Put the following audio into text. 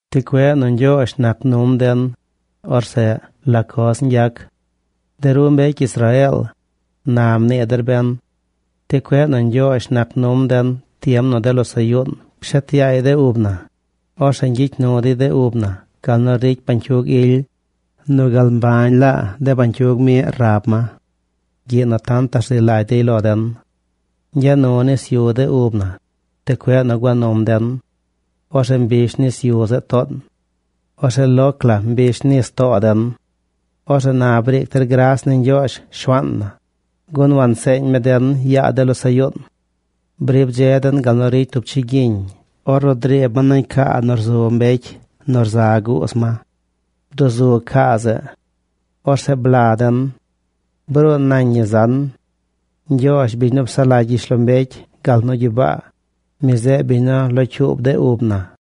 Ti cueꞌ nu Ñgyoozh nac num den, orzeꞌ ¿la coz ñgyac? De ru mbecy Israeel, na, mnii der ben. Ti cueꞌ nu Ñgyoozh nac num den tiem nu de losaꞌ yuun pshet yaay de ub na, orzeꞌ ñgyicy nu dey de ub na gal nu ricy bañcyug ily, nu gal mbañ laa de bañcyug miꞌ rab ma gyiꞌ nu tantaꞌ rzi lagy dey lo den. Ñgya nu nis yu de ub na, ti cueꞌ nu gua num den. Orzeꞌ mbish nis yu zeꞌ toon. Orzeꞌ ¡loc la mbish nis too den! Orzeꞌ na briic der gras ni Ñgyoozh, Shuaan na, gun wanseeñ mi den yaa de losaꞌ yuun. Brib dze den gal nu ricy tub chigyiñ ornu driib ma nañ caa nu rzu mbecy nu rza guuz ma. Bduzug caa zeꞌ. Orzeꞌ bla den. Bruun nañ ñi zan. Ñgyoozh, biñ nu psaꞌ lagy gyishlombecy gal nu gyibaa, mi zeꞌ biñ nu locyuub de ub na.